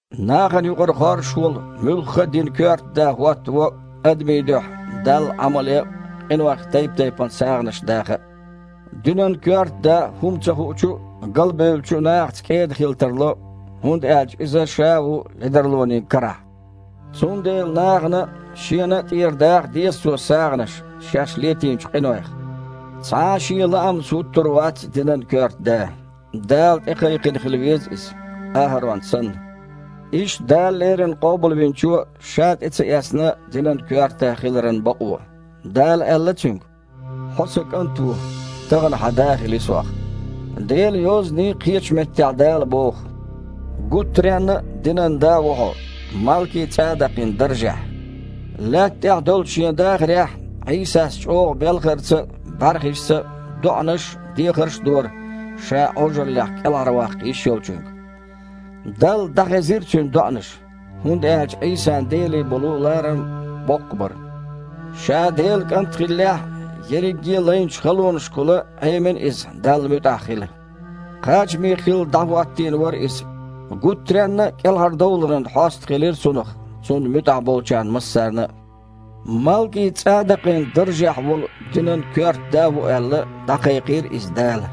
Нахана юкъара хоржуш волу муьлхха а динан коьрта да хІоттаво адамийн дуьхьа Далла Іамал ян а, къинойх тайп-тайпана сагІанаш даха а. Динан коьрта да хІума ца хуучу а, галбевллачу а нахаца кІеда хила тарло, хІунда аьлча иза ша а ву ледарлонийн карахь. Цундела нахана а, шена а тІера даха деза цо сагІанаш шаьш летийначу къинойх. Цхьа а шен лаамца хІуттур вац динан коьрта да. Дала тІекхайкхина хила веза иза, АхІарон санна. Иштта Дала леррина Къобалвинчо а Ша тІе ца эцна динан коьрта да хиларан бакъо. Дала аьлла Цуьнга: «Хьо Сан КІант ву, тахана Хьан Да хили Сох». Делан Йозанийн кхечу меттехь Дала боху: «Гуттаренна а динан да ву Хьо Малки-ЦІадакъин даржехь». Лаьтта тІехь долчу Шен дахарехь Іийсас чІогІачу белхарца а, бІаьрхишца а доІанаш а, дехарш а дора Ша Іожаллех кІелхьарваккха йиш Йолчуьнга. Далла дІахезира Цуьнан доІанаш, хІунда аьлча Іийсан Деле болу ларам боккха бара. Ша Делан КІант хиллехь а, ерриге а лайначу халонашкахула Іемина Иза Далла муьтІахь хила. Кхачаме хилла, дІахІоттийна вара Иза, гуттаренна а кІелхьардовларан хьоста хилира Цунах Цунна муьтІахь болчарна массарна а. Малки-ЦІадакъин даржехь волу динан коьрта да ву аьлла, дІакхайкхийра Иза Дала.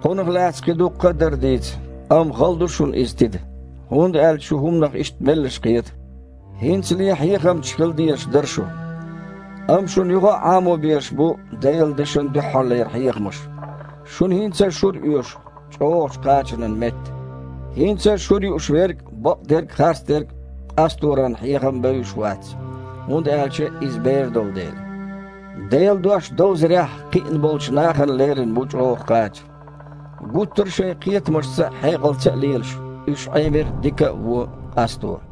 Кхунах лаьцна кхин дуккха а дара дийца, амма хала ду шуна иза тида, хІунда аьлча шу хІуманах иштта меллаша кхета. ХІинцале а хьехамчаш хила дезаш дара шу, амма шуна юха а Іамо безаш бу Делан дешан дуьххьарлера хьехамаш. Шуна хІинца а шура оьшу, чІогІачу кхачанан метта. ХІинца а шура юуш верг бакъдерг а, харцдерг а къасторан хьехам бевзаш вац, хІунда аьлча иза бер долу дела. Делан дош довзарехь кхиъна болчу нахана лерина бу чІогІа кхача. Гуттара а шайн кхетамашца а, хьекъалца а лелаш, уьш Іемира дика а, вон а къасто.